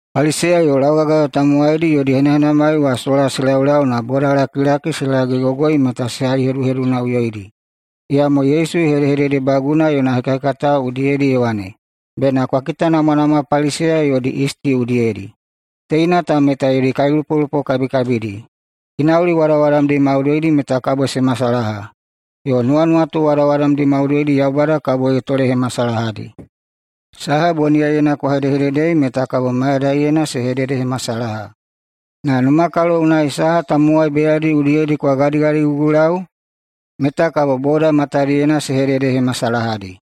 [Paliseya yo laugagayo taulauhekataena tamowaidi yodi henahenamai wa sola se laulau na] boda lakilakikalilina se lagegogoi meta se haiheduhedunaꞌuyoidi. Iyamo Yesu ye hedehededebaguna yona hekahekatao udiyedi ye wane, “Bena kwa kitanamwanamwa Paliseya yodi yisti udiyedi, teina ta meta yodi kailupolupo kabikabidi. Ginauli wadawadamdi maudoidi meta kabo se masalaha, yo nuwanuwatu wadawadamdi maudoidi Yaubada kabo ye tolehemasalahadi. Saha boniyaiyena kwa hedehededei meta kabo mayadaiyena se hededehemasalaha, na numakalo unai saha tamowai beyadi udiyedi kwa gadigadigugulau meta kabo boda matadiyena se hededehemasalahadi.”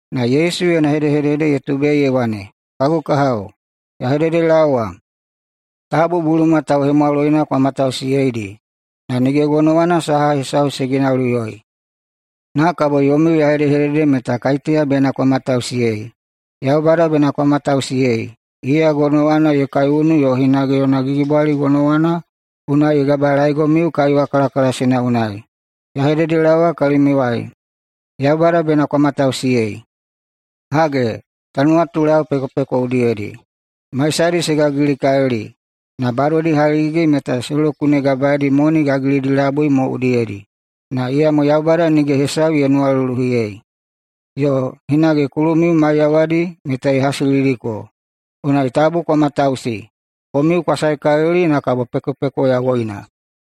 [Na Yesu yona hedehedede ye tubei ye wane,] “Kagu kahao, ya hededelaowa, tabu buluma tauhemwaloina kwa matausiyeidi, na nige gonowana saha hesau se ginauliꞌuyoi. Na kabo yomiu ya hedehedede meta kaiteya bena kwa matausiyei: [Yaubada] bena kwa matausiyei. Iya gonowana ye kaiunu yo hinage yona gigibwali gonowana unai ye gabalaegomiu kaiwa kalakalasina unai. Ya hededelaowa kalimiuwai: [Yaubada] bena kwa matausiyei! Hage, ta nuwatulau pekopeko udiyedi. Maisadi se gagilikalili, na badodi haligigi meta se lokuneidi moni gagilidi labui mo udiyedi. Na iyamo Yaubada nige hesau ye nuwaluluhiyei. Yo hinage kulumiu maiyawadi meta ye hasilidiko. Unai tabu kwa matausi. Komiu kwa saekalili na kabo pekopeko yawoina.”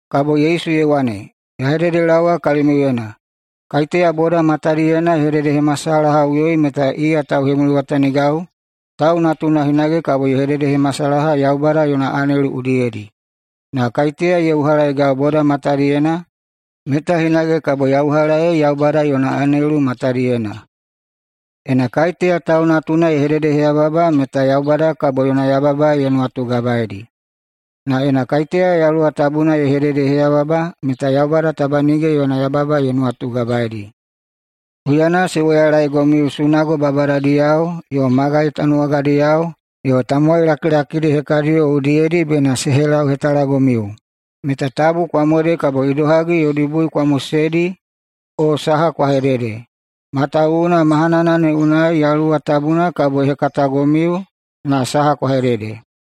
[Kabo Yesu ye wane,] “Ya hededelaowa kalimiuyena: Kaiteya boda matadiyena ye hededehemasalahaꞌuyoi meta iya tauhemuliwatanigau, Tau Natuna hinage kabo ye hededehemasalaha Yaubada yona anelu udiyedi. Na kaiteya ye uhalaegau boda matadiyena meta hinage kabo ya uhalaei Yaubada yona anelu matadiyena. Ena kaiteya Tau Natuna ye hededeheyababa meta Yaubada kabo yona yababa ne ye nuwatugabaei. Na ena kaiteya Yaluwa Tabuna ye hededeheyababa meta Yaubada taba nige yona yababa ne ye nuwatugabaei. Huyana se woyalaegomiu sunago babadadiyao yo magai tanuwagadiyao yo tamowai lakilakidi hekadiyo udiyedi bena se helauhetalagomiu, meta tabu kwa mode kabo idohagi yodi bui kwa moseidi o saha kwa hedede, matawuwuna mahanana ne unai Yaluwa Tabuna kabo ye hekatagomiu na saha kwa hedede.”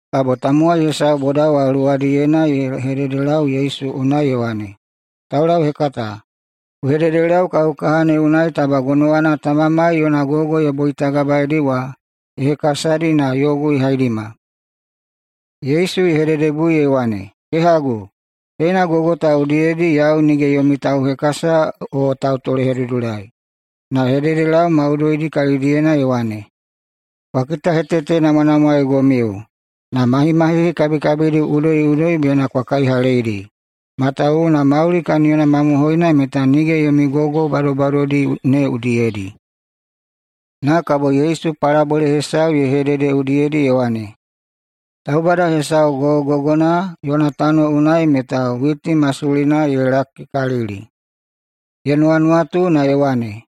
Kabo tamowai hesau boda wa luwadiyena ye hededelau Yesu unai ye wane, “Taulauhekata, ku hededelau kagu kaha ne unai taba gonowana tamamai yona gogo ye boitagabaeidi wa ye hekasadi na yogu ye haidima.” Yesu ye hededebui ye wane, “Kehagu, teina gogo ta udiyedi yau nige yomi tauhekasa o tautolehedudulai.” Na ye hededelau maudoidi kalidiyena ye wane, “Kwa kitahetetenamwanamwaegomiu na mahimahihi kabikabidi udoiꞌudoi bena kwa kaihaleidi. Matawuwuna mauli kaniyona mamohoina meta nige yomi gogo badobadodi ne udiyedi.” Na kabo Yesu palabole hesau ye hedede udiyedi ye wane, “Taubada hesau gogogogona yona tano unai meta witi masulina ye lakikalili. Ye nuwanuwatu na ye wane,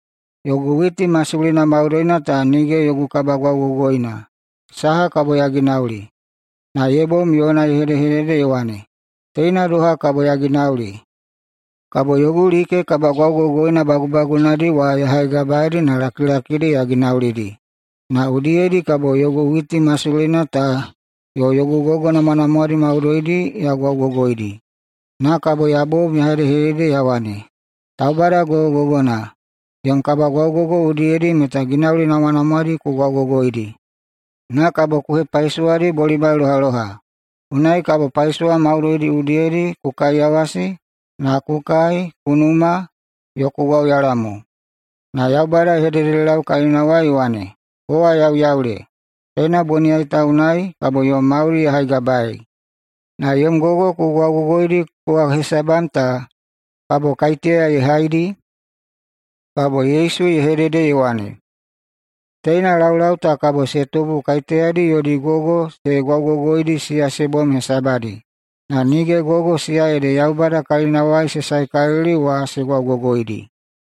‘Yogu witi masulina maudoina ta nige yogu kabagwaugogoina. Saha kabo ya ginauli?’ Na ye bom yona ye hedehedede ye wane, ‘Teina doha kabo ya ginauli: Kabo yogu like kabagwaugogoina bagubagunadi wa ya haigabaeidi na lakilakidi ya ginaulidi. Na udiyedi kabo yogu witi masulina ta yo yogu gogo namwanamwadi maudoidi ya gwaugogoidi. Na kabo ya bom ya hedede ya wane, “Taubada gogogogona, yom kabagwaugogo udiyedi meta ginauli namwanamwadi ku gwaugogoidi, na kabo ku hepaisowadi bolimai lohaloha. Unai kabo paisowa maudoidi udiyedi ku kaiyawasi, na ku kai, ku numa, yo ku gwauyala mo.” ’ Na Yaubada ye hededelau kalinawai ye wane, ‘Kowa yauyaule! Teina boniyai ta unai kabo yom mauli ya haigabaei, na yom gogo ku gwaugogoidi kowa hesabam ta kabo kaiteya ye haidi?’” [Kabo Yesu ye hedede ye wane,] “Teina laulau ta kabo se tubu kaiteyadi yodi gogo se gwaugogoidi siya se bom hesabadi, na nige gogo siya ede Yaubada kalinawai se saekalili wa se gwaugogoidi.”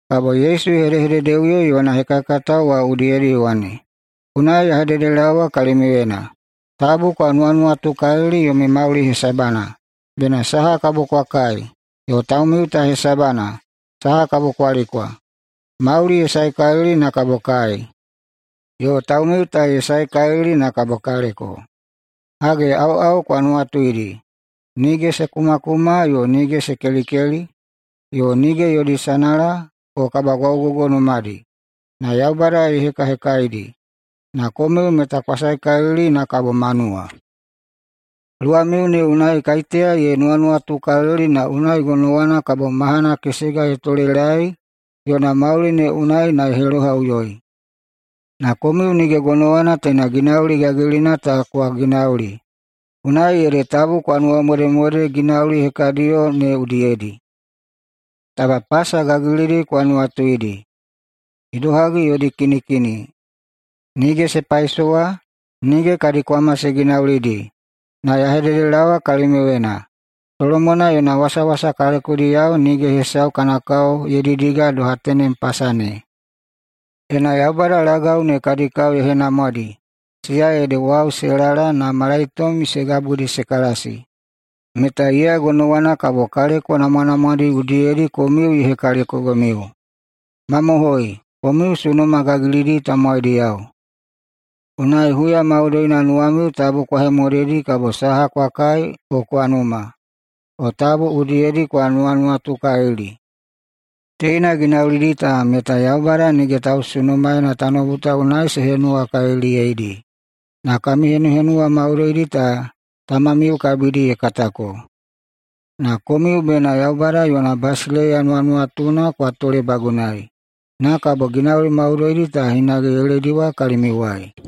Kabo Yesu ye hededeꞌuyo yona hekahekatao wa udiyedi ye wane, “Unai ya hededelaowa kalimiuyena: Tabu kwa nuwanuwatukalili yomi mauli hesabana, bena saha kabo kwa kai, yo taumiu ta hesabana, saha kabo kwa likwa. Mauli ye saekalili na kabo kai, yo taumiu ta ye saekalili na kabo kaleko! Hage, aoꞌao kwa nuwatuidi: Nige se kumakuma, yo nige se kelikeli, yo nige yodi sanala o kabagwaugogo numadi. Na Yaubada ye hekahekaidi. Na komiu meta kwa saekalili na kabo manuwa! Luwamiu ne unai kaiteya ye nuwanuwatukalili na unai gonowana kabo mahana kesega ye tolelaei yona mauli ne unai na ye helohaꞌuyoi? Na komiu nige gonowana teina ginauli gagilina ta kwa ginauli, unai ede tabu kwa nuwamodemode ginauli hekadiyo ne udiyedi. Taba pasa gagilidi kwa nuwatuidi idohagi yodi kinikini. Nige se paisowa, nige kadi kwama se ginaulidi, na ya hededelaowa kalimiuyena: Solomona yona wasawasa kalekodiyao nige hesau kana kao ye didiga doha tenem pasa ne. Ena Yaubada lagau ne kadi kao ye henamwadi, siya ede wau se lala na malaitom se gabudi se kalasi, meta iya gonowana kabo kaleko namwanamwadi udiyedi komiu ye hekalekogomiu. Mamohoi, komiu sunuma gagilidi tamowaidiyao! Unai huya maudoina nuwamiu tabu kwa hemodedi kabo saha kwa kai o kwa numa, yo tabu udiyedi kwa nuwanuwatukalili. Teina ginaulidi ta meta Yaubada nige tausunumaena tanoubu ta unai se henuwakaliliyeidi. Na kami henuhenuwa maudoidi ta tamamiu kabidi ye katako. Na komiu bena Yaubada yona basileiya nuwanuwatuna kwa tolebagunai, na kabo ginauli maudoidi ta hinage ye lediwa kalimiuwai.”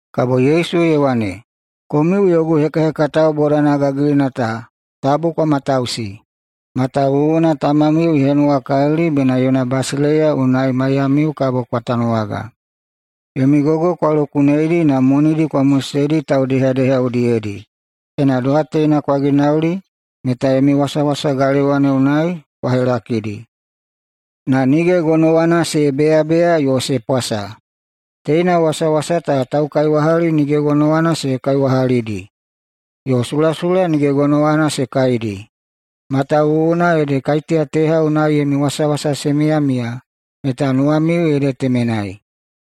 [Kabo Yesu ye wane,] “Komiu yogu hekahekatao bodana gagilina ta, tabu kwa matausi. Matawuwuna tamamiu ye henuwakalili bena yona basileiya unai maiyamiu kabo kwa tanuwaga. Yomi gogo kwa lokuneidi na monidi kwa moseidi taudehadeha udiyedi. Ena doha teina kwa ginauli meta yomi wasawasa galewa ne unai kwa helakidi, na nige gonowana se beyabeya yo se pwasa. Teina wasawasa ta taukaiwahali nige gonowana se kaiwahalidi yo sulasula nige gonowana se kaidi. Matawuwuna ede kaiteya teha unai yomi wasawasa se miyamiya, meta nuwamiu ede temenai.”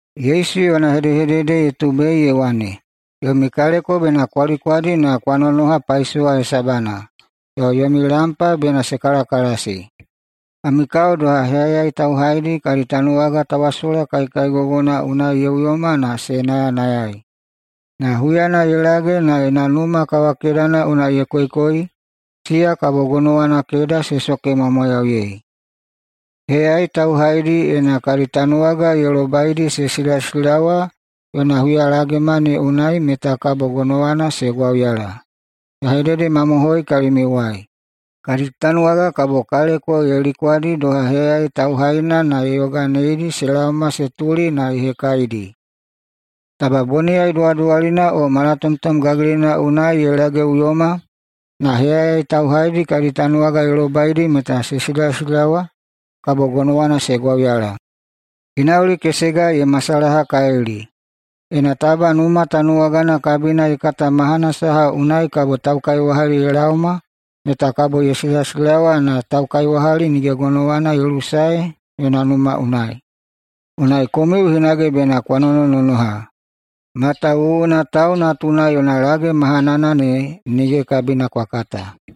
[Yesu yona hedehedede ye tubei ye wane,] “Yomi kaleko bena kwa likwadi na kwa nonoha paisowa hesabana yo yomi lampa bena se kalakalasi. Kami kao doha heyayai tauhaidi kadi tanuwaga tawasola kaikaigogona unai ye uyoma na se nayanayai. Na huyana ye lage na yona numa kawakedana unai ye koikoi, siya kabo gonowana keda se sokemwamwayauyei. Heyayai tauhaidi ena kadi tanuwaga ye lobaidi se silasilawa yona huyalagema ne unai, meta kabo gonowana se gwauyala. Ya hededemamohoi kalimiuwai: Kadi tanuwaga kabo kaleko ye likwadi doha heyayai tauhaina na ye yoganeidi se laoma se tuli na ye hekaidi. Taba boniyai duwaduwalina o malatomtom gagilina unai ye lageꞌuyoma na heyayai tauhaidi kadi tanuwaga ne ye lobaidi meta se silasilawa kabo gonowana se gwauyala. Ginauli kesega ye masalahakalili: Ena taba numa tanuwagana kabina ye kata mahana saha unai kabo taukaiwahali ye laoma meta kabo ye silasilawa na taukaiwahali nige gonowana ye lusae yona numa unai. Unai komiu hinage bena kwa nonononoha, matawuwuna Tau Natuna yona lage mahanana ne nige kabina kwa kata.”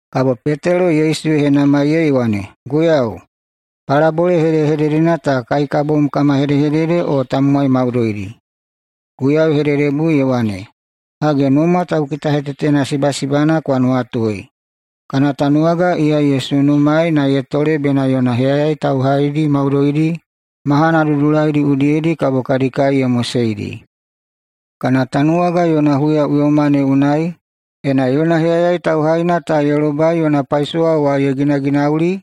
Kabo Petelo Yesu ye henamaiyei ye wane, “Guiyau, palabole hedehededena ta kai ka bom kama hedehedede o tamowai maudoidi?” Guiyau ye hededebui ye wane, “Hage, numa taukitahetetena sibasibana kwa nuwatui. Kana tanuwaga iya ye sunumaei na ye tole bena yona heyayai tauhaidi maudoidi mahana dudulaidi udiyedi kabo kadi kai ye moseidi. Kana tanuwaga yona huyaꞌuyoma ne unai, ena yona heyayai tauhaina ta ye lobai yona paisowa wa ye ginaginauli,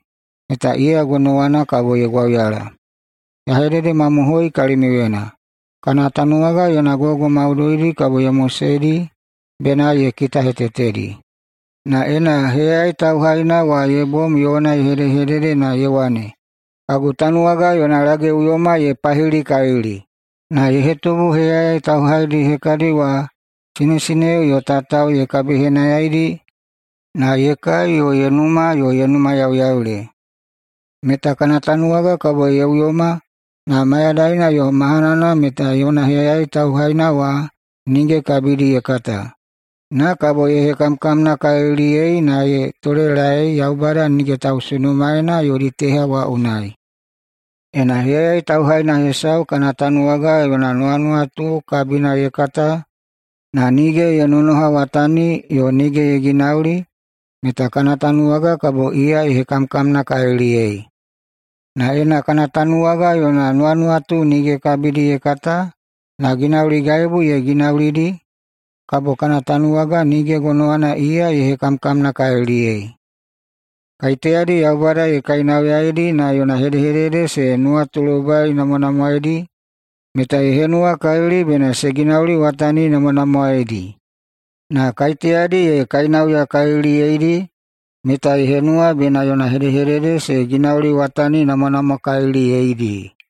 meta iya gonowana kabo ye gwauyala. Ya hededemamohoi kalimiuyena: Kana tanuwaga yona gogo maudoidi kabo ye moseidi bena ye kitahetetedi. Na ena heyayai tauhaina wa ye bom yona ye hedehedede na ye wane, ‘Kagu tanuwaga yona lageꞌuyoma ye pahilikalili,’ na ye hetubu heyayai tauhaidi hekadi wa sinesineo yo tatao ye kabihenayaidi na ye kai yo ye numa yo ye numayauyaule, meta kana tanuwaga kabo ye uyoma na mayadaina yo mahanana meta yona heyayai tauhaina wa nige kabidi ye kata. Na kabo ye hekamkamnakaliliyei na ye tolelae Yaubada nige tausunumaena yodi teha wa unai. Ena heyayai tauhaina hesau kana tanuwaga yona nuwanuwatu kabina ye kata, na nige ye nonohawatani yo nige ye ginauli, meta kana tanuwaga kabo iya ye hekamkamnakaliliyei. Na ena kana tanuwaga yona nuwanuwatu nige kabidi ye kata, na ginauligaibu ye ginaulidi, kabo kana tanuwaga nige gonowana iya ye hekamkamnakaliliyei. Kaiteyadi Yaubada ye kainauyaidi na yona hedehedede se nuwatulobainamwanamwaeidi meta ye henuwakalili bena se ginauliwataninamwanamwaeidi. Na kaiteyadi ye kainauyakaliliyeidi meta ye henuwa bena yona hedehedede se ginauliwataninamwanamwakaliliyeidi.”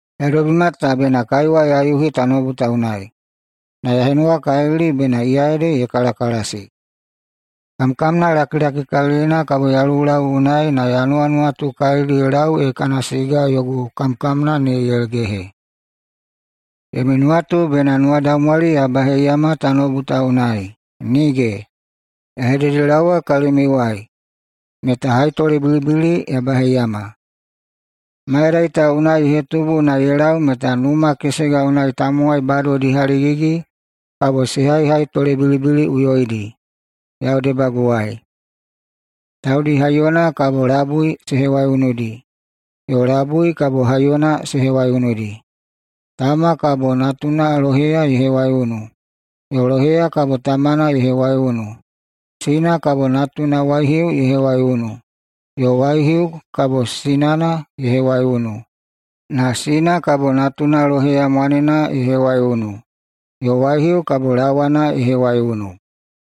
“Ya dobima ta bena kaiwa ya yuhi tanoubu ta unai, na ya henuwakalili bena iya ede ye kalakalasi. Kamkamna lakilakikalilina kabo ya lulau unai na ya nuwanuwatukalili ye lau ee kana siga yogu kamkamna ne ye gehe. Yomi nuwatu bena nuwadaumwali ya baheiyama tanoubu ta unai? Nige! Ya hededelaowa kalimiuwai meta haitolebilibili ya baheiyama. Mayadai ta unai ye hetubu na ye lau meta numa kesega unai tamowai badodi haligigi kabo se haihaitolebilibiliꞌuyoidi yau debaguwai, taudi haiyona kabo labui se hewaiunudi yo labui kabo haiyona se hewaiunudi. Tama kabo natuna loheya ye hewaiunu, yo loheya kabo tamana ye hewaiunu. Sina kabo natuna waihiu ye hewaiunu, yo waihiu kabo sinana ye hewaiunu. Na sina kabo natuna loheya mwanena ye hewaiunu, yo waihiu kabo lawana ye hewaiunu.”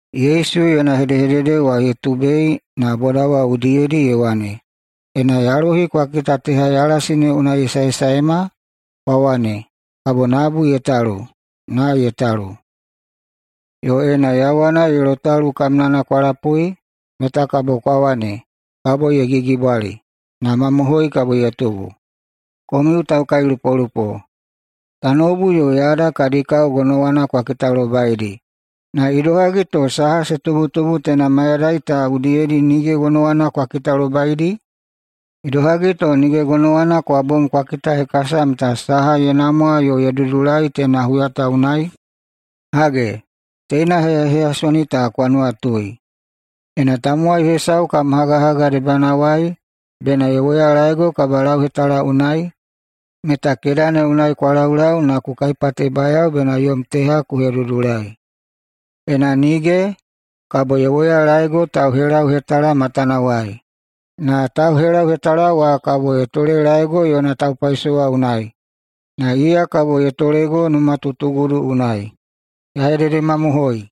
Yesu yona hedehedede wa ye tubei na boda wa udiyedi ye wane, “Ena yalohi kwa kita teha yalasi ne unai ye saesaema, kwa wane, kabo nabu ye talu, na ye talu. Yo ena yawana ye lotalu kamnana kwa lapui meta kwa wane, kabo ye gigibwali, na mamohoi kabo ye tubu. Komiu taukailupolupo! Tanoubu yo yada kadi kao gonowana kwa kitalobaidi. Na idohagi to saha se tubutubu teina mayadai ta udiyedi nige gonowana kwa kitalobaidi? Idohagi to nige gonowana kwa bom kwa kitahekasa meta saha ye namwa yo ye dudulai [teina huya ta unai]? [Hage, teina heyaheyasoni ta kwa nuwatui:] Ena tamowai hesau [kam hagahaga debanawai] bena ye woyalaego kabalauhetala unai, meta keda ne unai kwa laulau na ku kaipatebayao bena yom teha ku hedudulai. Ena nige, kabo ye woyalaego tauhelauhetala matanawai. Na tauhelauhetala wa kabo ye tolelaego yona taupaisowa unai, na iya kabo ye tolego numatutugudu unai. Ya hededemamohoi: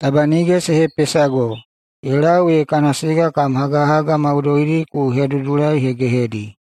Taba nige se hepesago ye lau ee kana siga kam hagahaga maudoidi ku hedudulaihegehedi.”